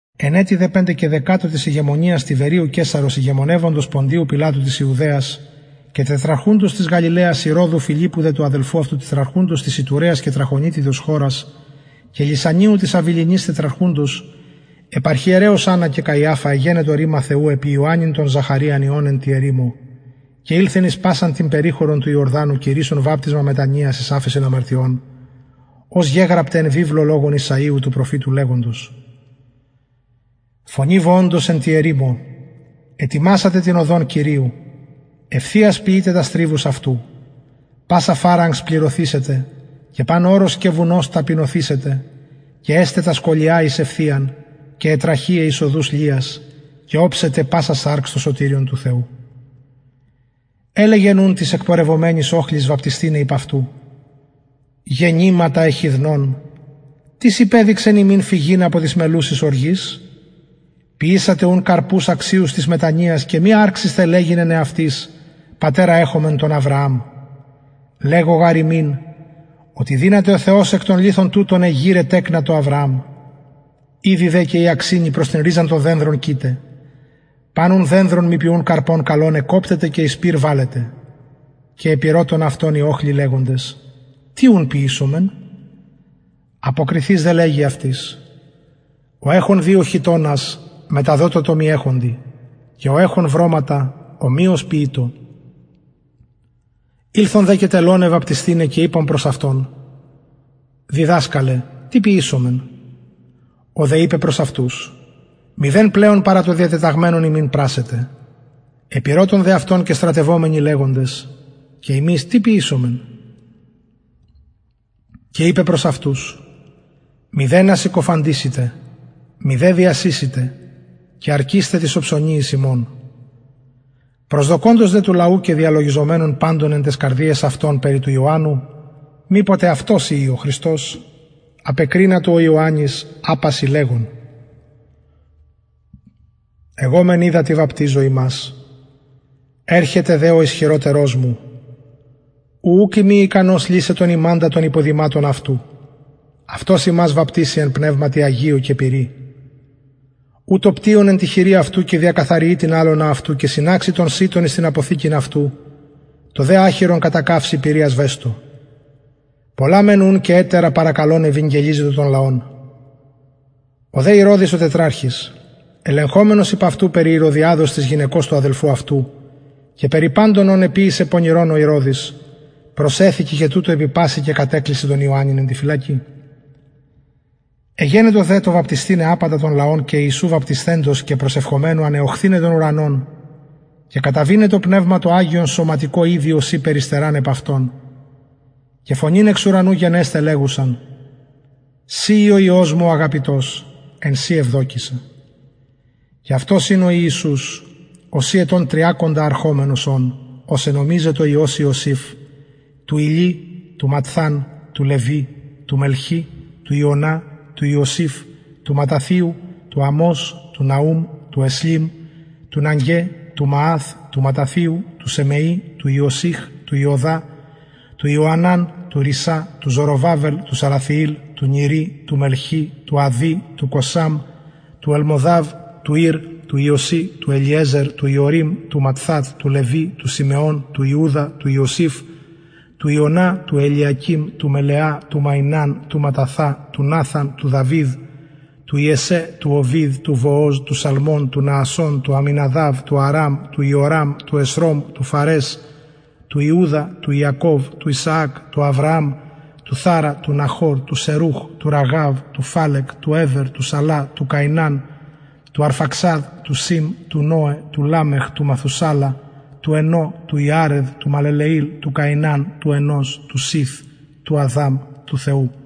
εν ετει δε πεντεκαιδεκατω της ηγεμονιας τιβεριου καισαρος ηγεμονευοντος ποντιου πιλατου της ιουδαιας και τετραρχουντος της γαλιλαιας ηρωδου φιλιππου δε του αδελφου αυτου τετραρχουντος της ιτουραιας και τραχωνιτιδος χωρας και λυσανιου της αβιληνης τετραρχουντος επι αρχιερεως αννα και καιαφα εγενετο ρημα θεου επι ιωαννην τον ζαχαριου υιον εν τη ερημω και ηλθεν εις πασαν την περιχωρον του ιορδανου κηρυσσων βαπτισμα μετανοιας εις αφεσιν αμαρτιων ως γεγραπται εν βιβλω λογων ησαιου του προφητου λεγοντος φωνη βοωντος εν τη ερημω ετοιμασατε την οδον κυριου ευθειας ποιειτε τας τριβους αυτου πασα φαραγξ πληρωθησεται και παν ορος και βουνος ταπεινωθησεται και εσται τα σκολια εις ευθειαν και αι τραχειαι εις οδους λειας και οψεται πασα σαρξ το σωτηριον του θεου ελεγεν ουν τοις εκπορευομενοις οχλοις βαπτισθηναι υπ αυτου γεννηματα εχιδνων τις υπεδειξεν υμιν φυγειν απο της μελλουσης οργης ποιησατε ουν καρπους αξιους της μετανοιας και μη αρξησθε λεγειν εν εαυτοις πατερα εχομεν τον αβρααμ λεγω γαρ υμιν οτι δυναται ο θεος εκ των λιθων τουτων εγειραι τεκνα τω αβρααμ ηδη δε και η αξινη προς την ριζαν των δενδρων κειται παν ουν δενδρον μη ποιουν καρπον καλον εκκοπτεται και εις πυρ βαλλεται και επηρωτων αυτον οι οχλοι λεγοντες τι ουν ποιησομεν αποκριθεις δε λεγει αυτοις ο εχων δυο χιτωνας μεταδοτω τω μη εχοντι και ο εχων βρωματα ομοιως ποιειτω ηλθον δε και τελωναι βαπτισθηναι και ειπον προς αυτον διδασκαλε τι ποιησομεν ο δε ειπεν προς αυτους μηδεν πλεον παρα το διατεταγμενον υμιν πρασσετε επηρωτων δε αυτον και στρατευομενοι λεγοντες και ημεις τι ποιησομεν και ειπεν προς αυτους μηδενα διασεισητε μηδε συκοφαντησητε και αρκεισθε τοις οψωνιοις υμων προσδοκωντος δε του λαου και διαλογιζομενων παντων εν ταις καρδιαις αυτων περι του ιωαννου μηποτε αυτος ειη ο χριστος απεκρινατο ο ιωαννης απασιν λεγων εγω μεν υδατι βαπτιζω υμας ερχεται δε ο ισχυροτερος μου ου ουκ ειμι ικανος λυσαι τον ιμαντα των υποδηματων αυτου αυτος υμας βαπτισει εν πνευματι αγιω και πυρι ου το πτυον εν τη χειρι αυτου και διακαθαριει την αλωνα αυτου και συναξει τον σιτον εις την αποθηκην αυτου το δε αχυρον κατακαυσει πυρι ασβεστω πολλα μεν ουν και ετερα παρακαλων ευηγγελιζετο τον λαον ο δε ηρωδης ο τετραρχης ελεγχομενος υπ αυτου περι ηρωδιαδος της γυναικος του αδελφου αυτου και περι παντων ων εποιησεν πονηρων ο ηρωδης προσεθηκεν και τουτο επι πασιν και κατεκλεισεν τον ιωαννην εν τη φυλακη εγενετο δε εν τω βαπτισθηναι απαντα τον λαον και ιησου βαπτισθεντος και προσευχομενου ανεωχθηναι τον ουρανον και καταβηναι το πνευμα το αγιον σωματικω ειδει ωσει περιστεραν επ αυτον και φωνην εξ ουρανου γενεσθαι λεγουσαν συ ει ο υιος μου ο αγαπητος εν σοι ευδοκησα και αυτος ην ο ιησους ωσει ετων τριακοντα αρχομενος ων ως ενομιζετο υιος ιωσηφ του ηλι του ματθατ του λευι του μελχι του ιαννα του ιωσηφ του ματταθιου του αμως του ναουμ του εσλι του ναγγαι του μααθ του ματταθιου του σεμει του ιωσηφ του ιουδα του ιωαναν του ρησα του ζοροβαβελ του σαλαθιηλ του νηρι του μελχι του αδδι του κωσαμ του ελμωδαμ του ηρ του ιωση του ελιεζερ του ιωρειμ του ματθατ του λευι του συμεων του ιουδα του ιωσηφ του ιωναν του ελιακειμ του μελεα του μαιναν του ματταθα του ναθαν του δαυιδ του ιεσσαι του ωβηδ του βοοζ του σαλμων του ναασσων του αμιναδαβ του αραμ του εσρωμ του φαρες του ιουδα του ιακωβ του ισαακ του αβρααμ του θαρα του ναχωρ του σερουχ του ραγαυ του φαλεγ του εβερ του σαλα του καιναν του αρφαξαδ του σημ του νωε του λαμεχ του μαθουσαλα του ενωχ του ιαρεδ του μαλελεηλ του καιναν του ενως του σηθ του αδαμ του θεου